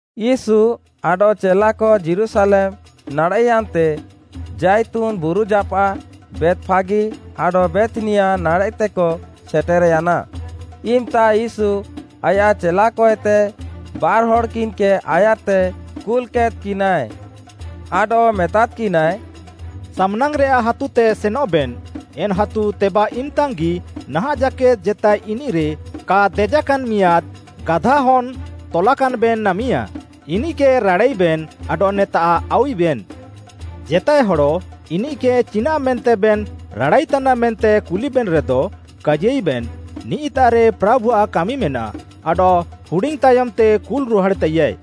ୟୀଶୁ ଆଡଃ ଚେଲାକ ଯୀରୁଶାଲେମ୍‌ ନାଡ଼େଃୟାନ୍‌ତେ, ଜାଇତୁନ୍‌ ବୁରୁଜାପାଃ ବେତ୍‌ଫାଗି ଆଡଃ ବେଥ୍‌ନିଆ ନାଡ଼େଃତେକ ସେଟର୍‌ୟାନା, ଇମ୍‌ତା ୟୀଶୁ ଆୟାଃ ଚେଲାକଏତେ ବାର୍‌ହଡ଼୍‌କିନ୍‌କେ ଆୟାର୍‌ତେ କୁଲ୍‌କେଦ୍‌କିନାଏ। ଆଡଃ ମେତାଦ୍‌କିନାଏ, “ସାମ୍‌ନାଙ୍ଗ୍‌ରେଆଃ ହାତୁତେ ସେନଃବେନ୍, ଏନ୍‌ ହାତୁ ତେବାଃ ଇମ୍‌ତାଙ୍ଗ୍‌ଗି ନାହାଁଃ ଜାକେଦ୍‌ ଜେତାଏ ଇନିଃରେ କା ଦେଜାକାନ୍ ମିଆଁଦ୍‌ ଗାଧାହନ୍‌ ତଲାକାନ୍‌ବେନ୍ ନାମିଆଁ, ଇନିଃକେ ରାଡ଼ାଇବେନ୍ ଆଡଃ ନେତାଃ ଆଉୱିବେନ୍। ଜେତାଏ ହଡ଼ ଇନିଃକେ ଚିନାଃ ମେନ୍ତେବେନ୍ ରାଡ଼ାଇତାନା ମେନ୍ତେ କୁଲିବେନ୍‌ରେଦ, କାଜିୟାଇବେନ୍‌, ନିଃ'ତାଃରେ ପ୍ରାଭୁଆଃ କାମିମେନାଃ, ଆଡଃ ହୁଡିଙ୍ଗ୍‌ତାୟମ୍‌ତେ କୁଲ୍‌ରୁହାଡ଼୍‌ତାଇୟା।”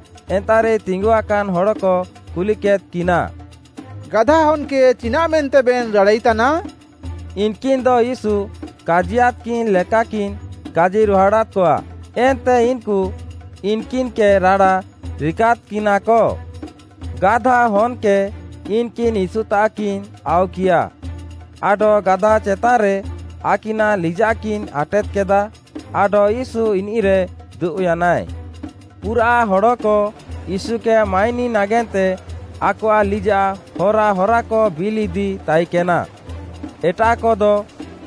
ଏନ୍ତାଃରେ ତିଙ୍ଗୁଆକାନ୍‌ ହଡ଼କ କୁଲିକେଦ୍‌କିନା, “ଗାଧାହନ୍‌କେ ଚିନାଃ ମେନ୍ତେବେନ୍ ରାଡ଼ାଇତାନା?” ଇନ୍‌କିନ୍‌ଦ ୟୀଶୁ କାଜିୟାଦ୍‌କିନ୍ ଲେକାକିନ୍‌ କାଜିରୁହାଡ଼ାଦ୍‌କଆ, ଏନ୍ତେ ଇନ୍‌କୁ ଇନ୍‌କିନ୍‌କେ ରାଡ଼ା ରିକାଦ୍‌କିନାକ। ଗାଧାହନ୍‌କେ ଇନ୍‌କିନ୍‌ ୟୀଶୁତାଃକିନ୍ ଆଉକିୟା, ଆଡଃ ଗାଧା ଚେତାନ୍‌ରେ ଆକିନାଃ ଲିଜାଃକିନ୍ ଆଟେଦ୍‌କେଦା, ଆଡଃ ୟୀଶୁ ଇନିଃରେ ଦୁବ୍‌ୟାନାଏ। ପୁରାଃ ହଡ଼କ ୟୀଶୁକେ ମାଇନି ନାଗେନ୍ତେ ଆକଆଃ ଲିଜାଃ ହରାହରାକ ବିଲ୍‌ଇଦି ତାଇକେନା; ଏଟାଃକଦ,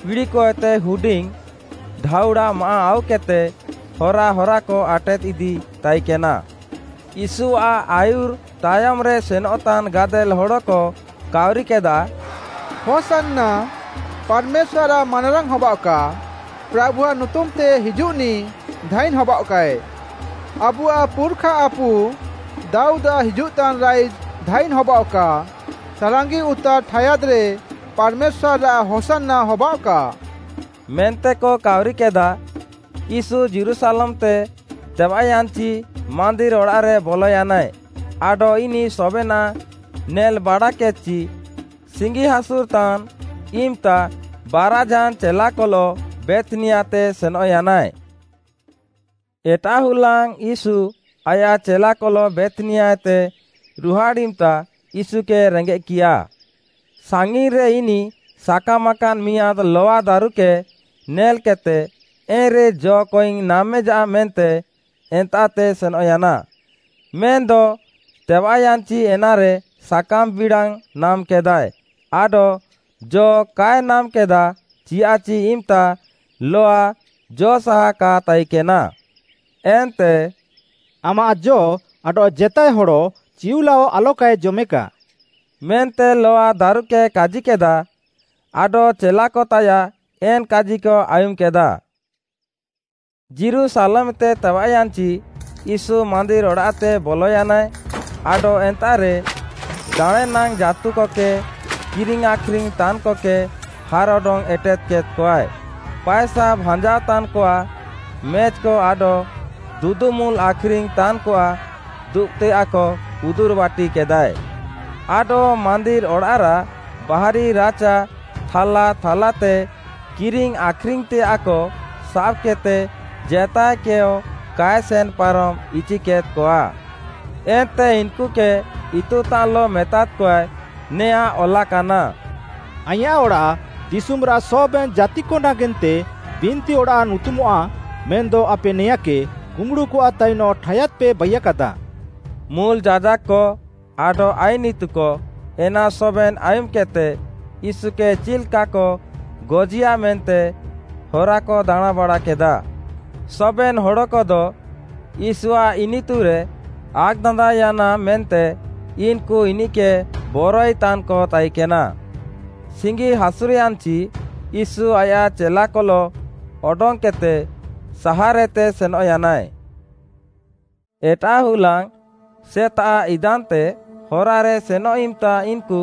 ପିଡ଼ିକଏତେ ହୁଡିଙ୍ଗ୍‌ ଢାଉଡ଼ା ମାଆଃ ଆଉକେଦ୍‌ତେ, ହରାହରାକ ଆଟେଦ୍ଇଦି ତାଇକେନା। ୟୀଶୁଆଃ ଆୟୁର୍‌ ତାୟମ୍‌ରେ ସେନଃତାନ୍‌ ଗାଦେଲ୍‌ ହଡ଼କ କାଉରିକେଦାଃ, “‘ହୋଶାନ୍ନା’ ପାର୍‌ମେଶ୍ୱାର୍‌ଆଃ ମାନାରାଙ୍ଗ୍‌ ହବାଅଃକା, ପ୍ରାଭୁଆଃ ନୁତୁମ୍‌ତେ ହିଜୁଃନିଃ ଧାଇନ୍‌ ହବାଅଃକାଏ। ଆବୁଆଃ ପୁର୍‌ଖାଆପୁ ଦାଉଦ୍‌ଆଃ ହିଜୁଃତାନ୍‌ ରାଇଜ୍‌ ଧାଇନ୍‌ ହବାଅଃକା, ସାଲାଙ୍ଗିଉତାର୍‌ ଠାୟାଦ୍‌ରେ ପାର୍‌ମେଶ୍ୱାର୍‌ରାଃ ହୋଶାନ୍ନା ହବାଅଃକା” ମେନ୍ତେକ କାଉରିକେଦାଃ। ୟୀଶୁ ଯୀରୁଶାଲେମ୍‌ତେ ତେବାଃୟାନ୍‌ଚି ମାନ୍ଦିର୍‌ ଅଡ଼ାଃରେ ବଲୟାନାଏ ଆଡଃ ଇନିଃ ସବେନାଃ ନେଲ୍‌ ବାଡ଼ାକେଦ୍‌ଚି ସିଙ୍ଗିହାସୁରଃତାନ୍ ଇମ୍‌ତା ବାରାଝାନ୍‌ ଚେଲାକଲଃ ବେଥ୍‌ନିଆତେ ସେନଃୟାନାଏ। ଏଟାଃ ହୁଲାଙ୍ଗ୍‌ ୟୀଶୁ ଆୟାଃ ଚେଲାକଲଃ ବେଥ୍‌ନିଆଏତେ ରୁହାଡ଼୍‌ ଇମ୍‌ତା, ୟୀଶୁକେ ରେଙ୍ଗେଃକିୟା। ସାଙ୍ଗିନ୍‌ରେ ଇନିଃ ସାକାମାକାନ୍‌ ମିଆଁଦ୍‌ ଲଆଦାରୁକେ ନେଲ୍‌କେଦ୍‌ତେ, ଏନ୍‌ରେ ଜ'କଇଙ୍ଗ୍‌ ନାମେଜାଃ ମେନ୍ତେ ଏନ୍ତାଃତେ ସେନଃୟାନା। ମେନ୍‌ଦ ତେବାଃୟାନ୍‌ଚି ଏନାରେ ସାକାମ୍‌ ବିଡ଼ାଙ୍ଗ୍‌ ନାମ୍‌କେଦାଏ ଆଡ଼ାଃ ଜ କାଏ ନାମ୍‌କେଦାଃ, ଚିୟାଃଚି ଇମ୍‌ତା ଲଆ ଜ'ସାହା କା ତାଇକେନା। ଏନ୍ତେ, “ଆମାଃ ଜ ଆଡଃ ଜେତାଏ ହଡ଼ ଚିଉଲାଅ ଆଲକାଏ ଜମେକା” ମେନ୍ତେ ଲଆ ଦାରୁକେ କାଜିକେଦା। ଆଡଃ ଚେଲାକତାୟାଃ ଏନ୍‌ କାଜିକ ଆୟୁମ୍‌କେଦା। ଯୀରୁଶାଲେମ୍‌ତେ ତେବାଃୟାନ୍‌ଚି, ୟୀଶୁ ମାନ୍ଦିର୍‌ ଅଡ଼ାଃତେ ବଲୟାନାଏ, ଆଡଃ ଏନ୍ତାଃରେ ଦାଣେଁନାଙ୍ଗ୍‌ ଜାଁତୁକକେ କିରିଙ୍ଗ୍‌ ଆଖ୍‌ରିଙ୍ଗ୍‌ ତାନ୍‌କକେ ହାର୍‌ଅଡଙ୍ଗ୍‌ ଏଟେଦ୍‌କେଦ୍‌ଆଏ। ପାଏସା ଭାଞ୍ଜାଅତାନ୍‌କଆଃ ମେଜ୍‌କ ଆଡଃ ଦୁଦୁମୁଲ୍‌ ଆଖ୍‌ରିଙ୍ଗ୍‌ ତାନ୍‌କଆଃ ଦୁବ୍‌ତେୟାଃକ ଉଦୁର୍‌ବାଟିକେଦାଏ। ଆଡଃ ମାନ୍ଦିର୍‌ ଅଡ଼ାଃରାଃ ବାହାରି ରାଚା ଥାଲା ଥାଲାତେ କିରିଙ୍ଗ୍‌ ଆଖ୍‌ରିଙ୍ଗ୍‌ତେଆଃକ ସାବ୍‌କେଦ୍‌ତେ ଜେତାଏକେୟ କାଏ ସେନ୍ ପାରମ୍‌ ଇଚିକେଦ୍‌କଆ। ଏନ୍ତେ ଇନ୍‌କୁକେ ଇତୁତାନ୍‌ଲଃ ମେତାଦ୍‌କଆଏ, ନେଆଁଁ ଅଲାକାନା, “ଆଇଁୟାଃ ଅଡ଼ାଃ ଦିଶୁମ୍‌ରାଃ ସବେନ୍‌ ଜାତିକ ନାଗେନ୍ତେ ବିନ୍ତିଅଡ଼ାଃ ନୁତୁମଃଆ ମେନ୍‌ଦ ଆପେ ନେଆଁଁକେ କୁମ୍ବୁଡ଼ୁକଆଃ ତାଇନଃ ଠାୟାଦ୍‌ପେ ବାଇୟାକାଦା।” ମୁଲ୍‌ ଯାଜାକ୍‌କ ଆଡଃ ଆଇନ୍‌ ଇତୁକ, ଏନା ସବେନ୍‌ ଆୟୁମ୍‌କେଦ୍‌ତେ, ୟୀଶୁକେ ଚିଲ୍‌କାକ ଗଜିୟା ମେନ୍ତେ ହରାକ ଦାଣାଁଁବାଡ଼ାକେଦାଃ। ସବେନ୍‌ ହଡ଼କଦ ୟୀଶୁଆଃ ଇନିତୁରେ ଆକ୍‌ଦାନ୍ଦାଅୟାନା ମେନ୍ତେ ଇନ୍‌କୁ ଇନିଃକେ ବରଆଇତାନ୍‌କ ତାଇକେନା। ସିଙ୍ଗିହାସୁର୍‌ୟାନ୍‌ଚି ୟୀଶୁ ଆୟାଃ ଚେଲାକଲଃ ଅଡଙ୍ଗ୍‌କେଦ୍‌ତେ ସାହାର୍‌ଏତେ ସେନଃୟାନାଏ। ଏଟାଃ ହୁଲାଙ୍ଗ୍‌ ସେତାଃ ଇଦାନ୍‌ତେ ହରାରେ ସେନଃ ଇମ୍‌ତା ଇନ୍‌କୁ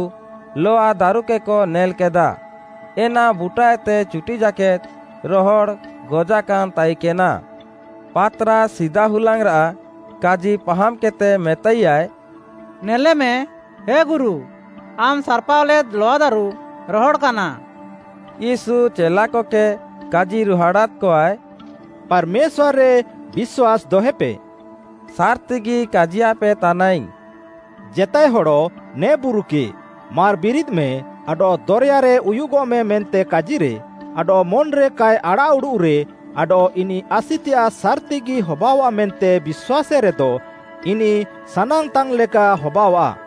ଲଆଦାରୁକେକ ନେଲ୍‌କେଦା। ଏନା ବୁଟାଏତେ ଚୁଟି ଜାକେଦ୍‌ ରହଡ଼୍‌ ଗଜାକାନ୍‌ ତାଇକେନା। ପାତ୍‌ରାସ୍‌ ସିଦାହୁଲାଙ୍ଗ୍‌ରାଃ କାଜି ପାହାମ୍‌କେଦ୍‌ତେ ମେତାଇୟାଏ “ନେଲେମେ, ହେ ଗୁରୁ, ଆମ୍‌ ସାର୍‌ପାଅଲେଦ୍ ଲଆଦାରୁ ରହଡ଼୍‌କାନା।” ୟୀଶୁ ଚେଲାକକେ କାଜିରୁହାଡ଼ାଦ୍‌କଆଏ, “ପାର୍‌ମେଶ୍ୱାର୍‌ରେ ବିଶ୍ୱାସ୍‌ ଦହେପେ।” ସାର୍‌ତିଗି କାଜିୟାପେ ତାନାଇଙ୍ଗ୍‌, “ଜେତାଏ ହଡ଼ ନେ ବୁରୁକେ, ମାର୍‌ ବିରିଦ୍‌ମେ ଆଡଃ ଦରେୟାରେ ଉୟୁଗଃମେ ମେନ୍ତେ କାଜିରେ, ଆଡଃ ମନ୍‌ରେ କାଏ ଆଡ଼ାଃଉଡ଼ୁଃରେ ଆଡଃ ଇନିଃ ଆସିତେୟାଃ ସାର୍‌ତିଗି ହବାଅଆଃ ମେନ୍ତେ ବିଶ୍ୱାସେରେଦ, ଇନିଃ ସାନାଙ୍ଗ୍‌ତାନ୍‌ଲେକା ହବାଅଆଃ।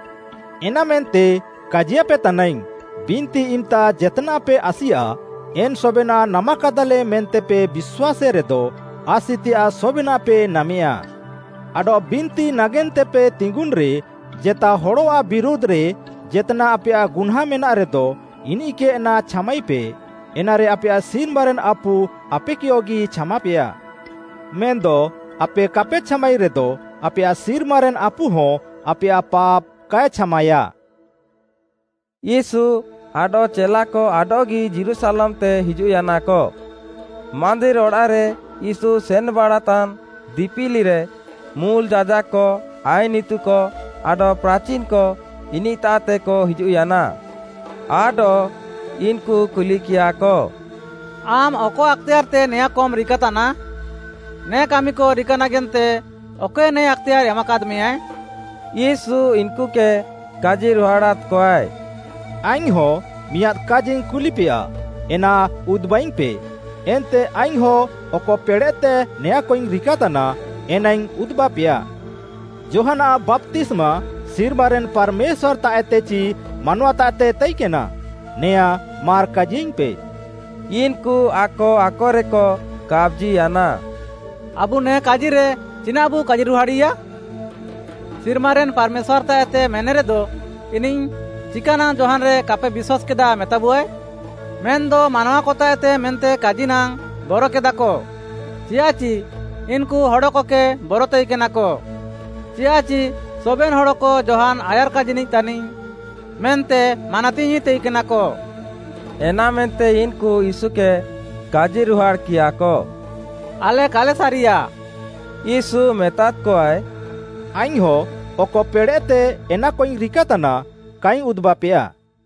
ଏନାମେନ୍ତେ କାଜିୟାପେ ତାନାଇଙ୍ଗ୍‌, ବିନ୍ତି ଇମ୍‌ତା ଜେତ୍‌ନାଃପେ ଆସିଆ, ଏନ୍‌ ସବେନାଃ ନାମାକାଦାଃଲେ ମେନ୍ତେପେ ବିଶ୍ୱାସେରେଦ, ଆସିତେୟାଃ ସବେନାଃପେ ନାମେୟା। ଆଡଃ ବିନ୍ତି ନାଗେନ୍ତେପେ ତିଙ୍ଗୁନ୍‌ରେ ଜେତା ହଡ଼ଆଃ ବିରୁଧ୍‌ରେ ଜେତ୍‌ନାଃ ଆପେୟାଃ ଗୁହ୍ନାଁଁ ମେନାଃରେଦ, ଇନିଃକେ ଏନା ଛାମାଇପେ, ଏନାରେ ଆପେୟାଃ ସିର୍ମାରେନ୍‌ ଆପୁ ଆପେକେୟଗି ଛାମାପେୟା। ମେନ୍‌ଦ ଆପେ କାପେ ଛାମାଇରେଦ, ଆପେୟାଃ ସିର୍ମାରେନ୍‌ ଆପୁହଁ ଆପେୟାଃ ପାପ୍‌ କାଏ ଛାମାଏଆ।” ୟୀଶୁ ଆଡଃ ଚେଲାକ ଆଡଃଗି ଯୀରୁଶାଲେମ୍‌ତେ ହିଜୁଃୟାନାକ। ମାନ୍ଦିର୍‌ଅଡ଼ାଃରେ ୟୀଶୁ ସେନ୍‌ବାଡ଼ାତାନ୍ ଦିପିଲିରେ, ମୁଲ୍‌ ଯାଜାକ୍‌କ, ଆଇନ୍‌ ଇତୁକ ଆଡଃ ପ୍ରାଚିନ୍‌କ ଇନିଃତାଃତେକ ହିଜୁଃୟାନା। ଆଡଃ, ଇନ୍‌କୁ କୁଲିକିୟାଃକ, “ଆମ୍‌ ଅକ ଆକ୍‌ତେୟାର୍‌ତେ ନେଆଁଁକମ୍‌ ରିକାତାନା? ନେ କାମିକ ରିକାନାଗେନ୍ତେ ଅକଏ ନେ ଆକ୍‌ତେୟାର୍‌ ଏମାକାଦ୍‌ମେଆ?” ୟୀଶୁ ଇନ୍‌କୁକେ କାଜିରୁହାଡ଼ାଦ୍‌କଆଏ, “ଆଇଙ୍ଗ୍‌ହଁ ମିଆଁଦ୍‌ କାଜିଙ୍ଗ୍‌ କୁଲିପେୟା, ଏନା ଉଦୁବାଇଙ୍ଗ୍‌ପେ, ଏନ୍ତେ ଆଇଙ୍ଗ୍‌ହଁ ଅକ ପେଡ଼େଃତେ ନେଆଁଁକଇଙ୍ଗ୍‌ ରିକାତାନା, ଏନାଇଙ୍ଗ୍‌ ଉଦୁବାପେୟା। ଯୋହାନ୍‌ଆଃ ବାପ୍ତିସ୍ମା ସିର୍ମାରେନ୍‌ ପାର୍‌ମେଶ୍ୱାର୍‌ତାଃଏତେ ଚି ମାନୱାତାଃଏତେ ତାଇକେନା? ନେଆଁଁ, ମାର୍‌ କାଜିୟାଇଙ୍ଗ୍‌ପେ।” ଇନ୍‌କୁ ଆକ ଆକରେକ କାପ୍‌ଜିୟାନା, “ଆବୁ ନେ କାଜିରେ ଚିନାଃବୁ କାଜିରୁହାଡ଼ିୟା? ‘ସିର୍ମାରେନ୍‌ ପାର୍‌ମେଶ୍ୱାର୍‌ତାଃଏତେ’ ମେନେରେଦ, ଇନିଃ ‘ଚିକାନାଙ୍ଗ୍‌ ଯୋହାନ୍‌ରେ କାପେ ବିଶ୍ୱାସ୍‌କେଦା’ ମେତାବୁଆଏ?” ମେନ୍‌ଦ ମାନୱାକତାଃଏତେ ମେନ୍ତେ କାଜିନାଙ୍ଗ୍‌ ବରକେଦାଃକ ଚିୟାଃଚି, ଇନ୍‌କୁ ହଡ଼କକେ ବର ତାଇକେନାକ, ଚିୟାଃଚି ସବେନ୍‌ ହଡ଼କ ଯୋହାନ୍‌ ଆୟାର୍‌କାଜିନିଃ ତାନିଃ ମେନ୍ତେ ମାନାତିଙ୍ଗ୍‌ଇ ତାଇକେନାକ। ଏନାମେନ୍ତେ ଇନ୍‌କୁ ୟୀଶୁକେ କାଜିରୁହାଡ଼୍‌କିୟାଃକ, “ଆଲେ କାଲେ ସାରିଆଃ।” ୟୀଶୁ ମେତାଦ୍‌କଆଏ, “ଆଇଙ୍ଗ୍‌ହଁ ଅକ ପେଡ଼େଃତେ ଏନାକଇଙ୍ଗ୍‌ ରିକାତାନା, କାଇଙ୍ଗ୍‌ ଉଦୁବାପେୟା।”